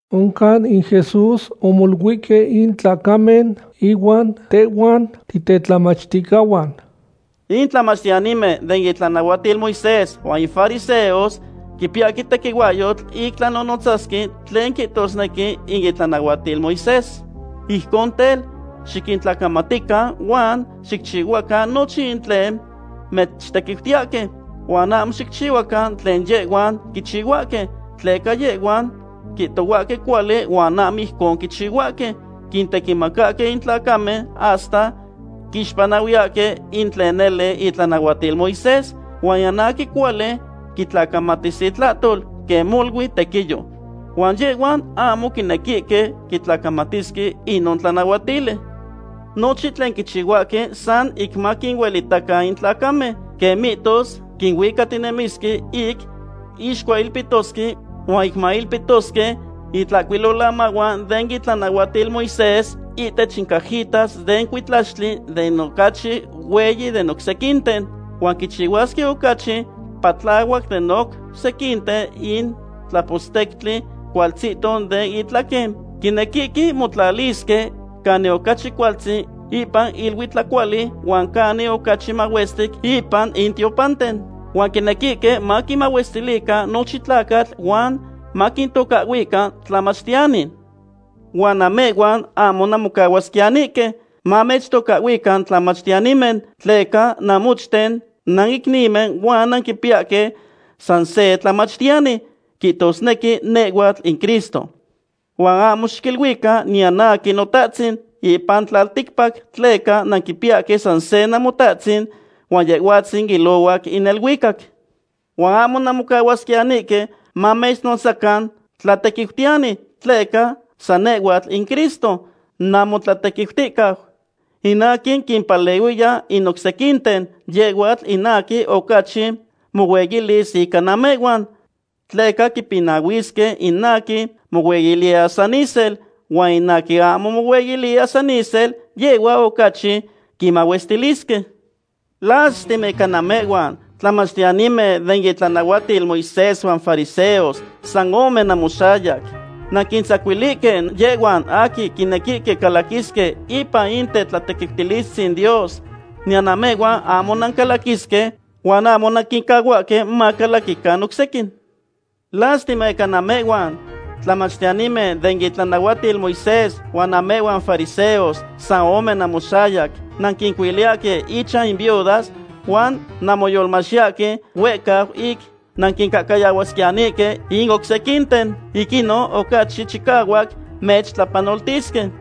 Oncan in Jesús omoluihque in tlacamen ihuan tehhuan titetlamachticahuan: ―In tlamachtiyanimen den itlanahuatil Moisés huan in fariseos quipiyahque tequihuahyotl ic tlanonotzasque tlen quihtosnequi in itlanahuatil Moisés. Ijcon tel, xiquintlacamatican huan xicchihuacan nochin tlen mechtequiutiyahque, huan ahmo xicchihuacan quen yehhuan quichihuahque, tleca yehhuan quihtohuahque cuali huan ahmo ijcon quichihuahque. Quintequimacahque in tlacamen hasta quixpanahuiyahque in tlen nele itlanahuatil Moisés, huan niyan aquin cuali quitlacamatis intlahtol, quen molui tequiyo. Huan yehhuan ahmo quinequihque quitlacamatisque inon tlanahuatili. Nochin tlen quichihuahque san ic maquinuelitacan in tlacamen. Quen mihtos quihuicatinemisque ic ixcuailpitosque huan ic mailpitosque intlacuilolamahuan den itlanahuatil Moisés ihtech in cajitas den cuitlaxtli tlen ocachi hueyi den oc sequinten. Huan quichihuasque ocachi patlahuac den oc sequinten in tlapostectli cualtzihto den intlaquen. Quinequihque motlalisque canin ocachi cualtzin ipan in iluitlacuali huan canin ocachi mahuestic ipan in tiopanten. Huan quinequihque maquinmahuestilican nochin tlacatl huan maquintocahhuican “Tlamachtiyani.” ’Huan namehhuan ahmo nanmocahuasquiyanihque mamechtocahhuican tlamachtiyanimen, tleca namochten nanicnimen huan nanquipiyahque san se tlamachtiyani, quihtosnequi nehhuatl in Cristo. Huan ahmo xiquiluican niyan aquin “notahtzin” ipan tlalticpac, tleca nanquipiyahque san se Namotatzin, huan Yehhuatzin ilohuac in neluicac. Huan ahmo nanmocahuasquiyanihque mamechnotzacan “tlatequiutiyani”, tleca san nehhuatl in Cristo namotlatequiuticau. In aquin quimpalehuiya in oc sequinten, yehhuatl in aquin ocachi mohueyilis ica namehhuan. Tleca quipinahuisque in aquin mohueyiliya san isel, huan in aquin ahmo mohueyiliya san isel, yehhua ocachi quimahuestilisque. ’¡Lastima ica namehhuan, tlamachtiyanimen den itlanahuatil Moisés huan fariseos, san ome namoxayac! Nanquintzacuilihque yehhuan aquin quinequihque calaquisque ipan in tetlatequiutilistzin Dios. Niyan namehhuan ahmo nancalaquisque, huan ahmo nanquincahuahque macalaquican oc sequin. ’¡Lastima ica namehhuan, tlamachtiyanimen den itlanahuatil Moisés huan namehhuan fariseos, san ome namoxayac! Nanquincuiliyahque inchan in viudas huan nanmoyolmachtiyahque huehcau ic nanquincahcayahuasquiyanihque in oc sequinten. Ic inon ocachi chicahuac mechtlapanoltisque.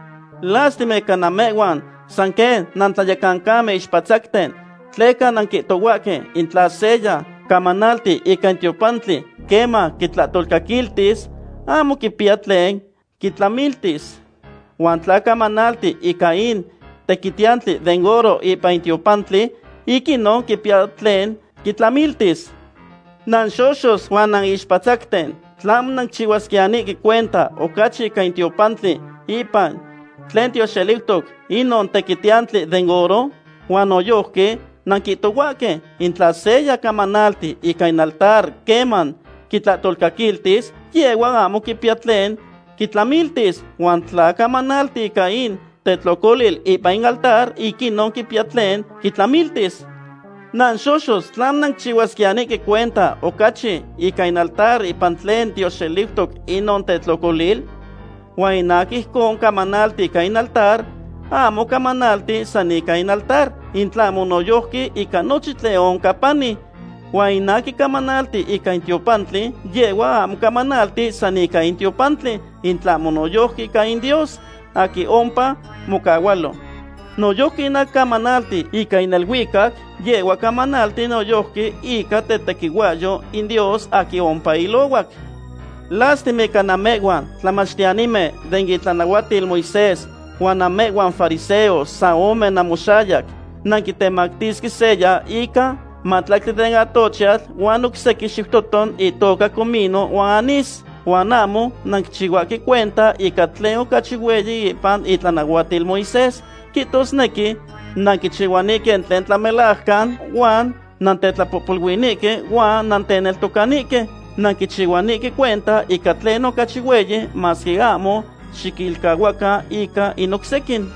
’¡Lastima ica namehhuan, san quen nantlayecancamen ixpatzacten! Tleca nanquihtohuahque: “In tla seya camanalti ica in tiopantli queman quitlahtolcaquiltis, ahmo quipiya tlen quitlamiltis. Huan tla camanalti ica in tequitiyantli den oro ipan in tiopantli, ic inon quipiya tlen quitlamiltis.” ¡Nanxoxos huan nanixpatzacten! ¿Tlahmo nanquichihuasquiyanihque cuenta ocachi ica in tiopantli ipan tlen tioxeliutoc inon tequitiyantli den oro? Huan noyojqui nanquihtohuahque: “In tla seya camanalti ica in altar queman quitlahtolcaquiltis, yehhua ahmo quipiya tlen quitlamiltis. Huan tla camanalti ica in tetlocolil ipan in altar, ic inon quipiya tlen quitlamiltis.” ¡Nanxoxos! ¿Tlahmo nanquichihuasquiyanihque cuenta ocachi ica in altar ipan tlen tioxeliutoc inon tetlocolil? Huan in aquin ijcon camanalti ica in altar, ahmo camanalti san ica in altar, in tlahmo noyojqui ica nochin tlen oncan pani. Huan in aquin camanalti ica in tiopantli, yehhua ahmo camanalti san ica in tiopantli, in tlahmo noyojqui ica in Dios, aquin ompa mocahualo. Noyojqui in aquin camanalti ica in neluicac, yehhua camanalti noyojqui ica tetequihuahyou in Dios aquin ompa ilohuac. ’¡Lastima ica namehhuan, tlamachtiyanimen den itlanahuatil Moisés huan namehhuan fariseos, san ome namoxayac! Nanquitemactisque seya ica mahtlactli den atochiatl huan oc sequin xiutoton itoca comino huan anís. Huan ahmo nanquichihuahque cuenta ica tlen ocachi hueyi ipan itlanahuatil Moisés. Quihtosnequi nanquichihuanihque in tlen tlamelajcan huan nantetlapohpoluinihque huan nanteneltocanihque. Nanquichihuanihque cuenta ica tlen ocachi hueyi, masque ahmo xiquilcahuacan ica in oc sequin.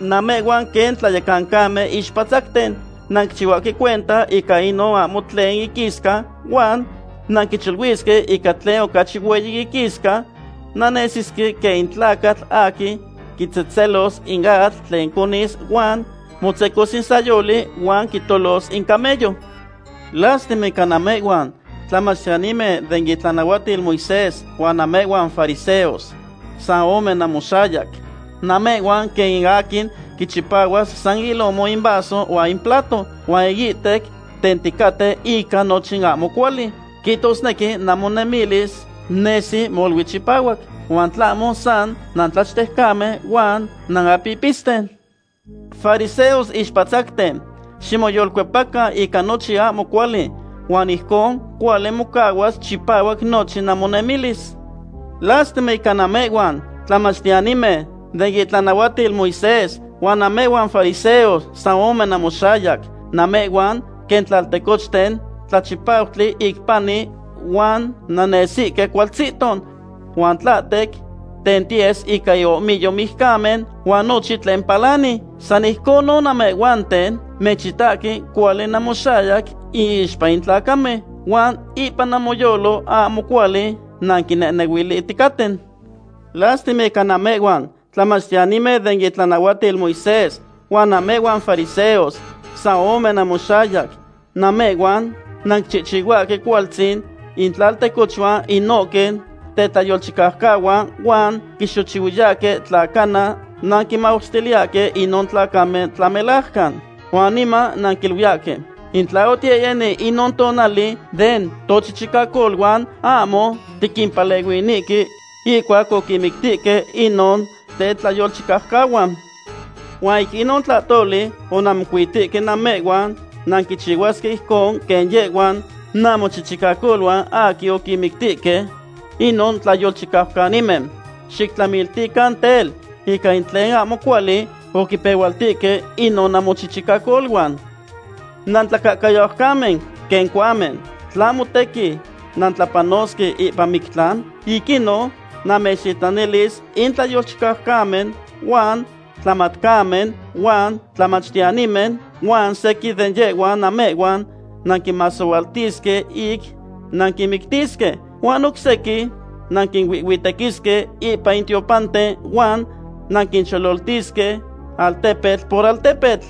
¡Namehhuan quen tlayecancamen ixpatzacten! Nanquichihuahque cuenta ica inon ahmo tlen iquisca huan nanquicholuisque ica tlen ocachi hueyi iquisca. Nannesihque quen in tlacatl aquin quitzehtzelos in atl tlen conis huan motzecos in tzayoli huan quitolos in camello. ’¡Lastima ica namehhuan, tlamachtiyanimen den itlanahuatil Moisés huan namehhuan fariseos, san ome namoxayac! Namehhuan quen in aquin quichipahuas san ilomo in vaso huan in plato, huan iihtec tenticaten ica nochin ahmo cuali. Quihtosnequi namonemilis nesi molui chipahuac, huan tlahmo san nantlachtejcamen huan nanapipisten. ¡Fariseos ixpatzacten! Ximoyolcuepacan ica nochin ahmo cuali huan ijcon cuali mocahuas chipahuac nochin namonemilis. ’¡Lastima ica namehhuan, tlamachtiyanimen den itlanahuatil Moisés, huan namehhuan fariseos, san ome namoxayac! Namehhuan quen tlaltecochten tlachipautli ic pani huan nannesihque cualtzihto. Huan tlahtec tentiyes ica iohmiyo mijcamen huan nochin tlen palanqui. San ijconon namehhuanten. Mechitahque cuali namoxayac iixpa in tlacamen, huan ipan namoyolo ahmo cuali nanquinehnehuilihticaten. ’¡Lastima ica namehhuan, tlamachtiyanimen den itlanahuatil Moisés, huan namehhuan fariseos, san ome namoxayac! Namehhuan nanquichihchihuahque cualtzin intlaltecochuan inohque tetlayolchicaucahuan huan quinxochihuiyahque tla cana nanquinmahuestiliyahque inon tlacamen tlamelajcan. Huan niman nanquiluiyahque: “In tla otiyehyeni inon tonali den tochichicacoluan, ahmo tiquimpalehuinihque ihcuac oquinmictihque inon tetlayolchicaucahuan.” Huan ic inon tlahtoli onanmocuitihque namehhuan nanquichihuasque ijcon quen yehhuan namochichicacoluan aquin oquinmictihque inon tlayolchicaucanimen. Xictlamiltican tel, ica in tlen ahmo cuali oquipehualtihque inon namochichicacoluan. ’¡Nantlacahcayaucamen, quen cohuamen! ¿Tlahmo tequin nantlapanosque ipan mictlan? Ic inon namechtitlanilis in tlayolchicaucanimen huan tlamatcamen huan tlamachtiyanimen. Huan sequin de yehhuan namehhuan nanquinmasohualtisque ic nanquinmictisque. Huan oc sequin nanquinuihhuitequisque ipan in tiopanten huan nanquinchololtisque altepetl por altepetl.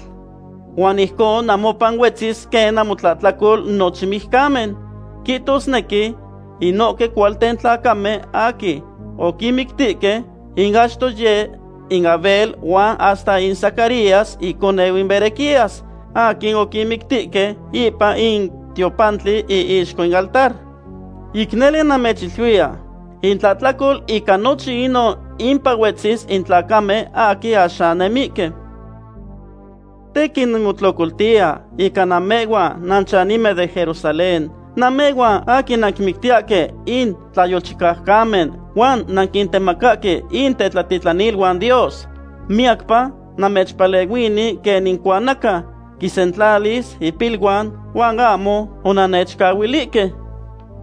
Huan ijcon namopan huetzi quen namotlahtlacol nochin mijcamen, quihtosnequi inohque cualten tlacamen aquin oquinmictihque. In achto yeh in Abel huan hasta in Zacarías iconeu in Berequías, aquin oquimictihque ipan in tiopantli iixco in altar. Ic nele namechiluiya, intlahtlacol ica nochin inon impan huetzi in tlacamen aquin axan nemihque. ’Tequin nimotlocoltiya ica namehhuan nanchanimen den Jerusalén. Namehhuan aquin nanquinmictiyahque in tlayolchicaucanimen huan nanquintemacahque in tetlatitlaniluan Dios. Miyacpa namechpalehuini quen in cuanaca quinsentlalis ipiluan, huan ahmo onannechcahuilihque.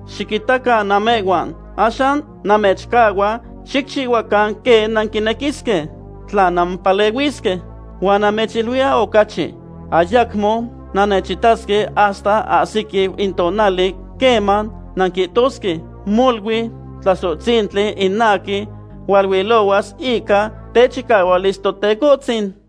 Xiquitacan namehhuan. Axan namechcahua xicchihuacan quen nanquinequisque, tla nanmopalehuisque. Huan namechiluiya ocachi, ayacmo nannechitasque hasta ahsiquiu in tonali queman nanquihtosque: “Molui Tlasohtzintli in aquin hualuilohuas ica techicahualis Totecohtzin.”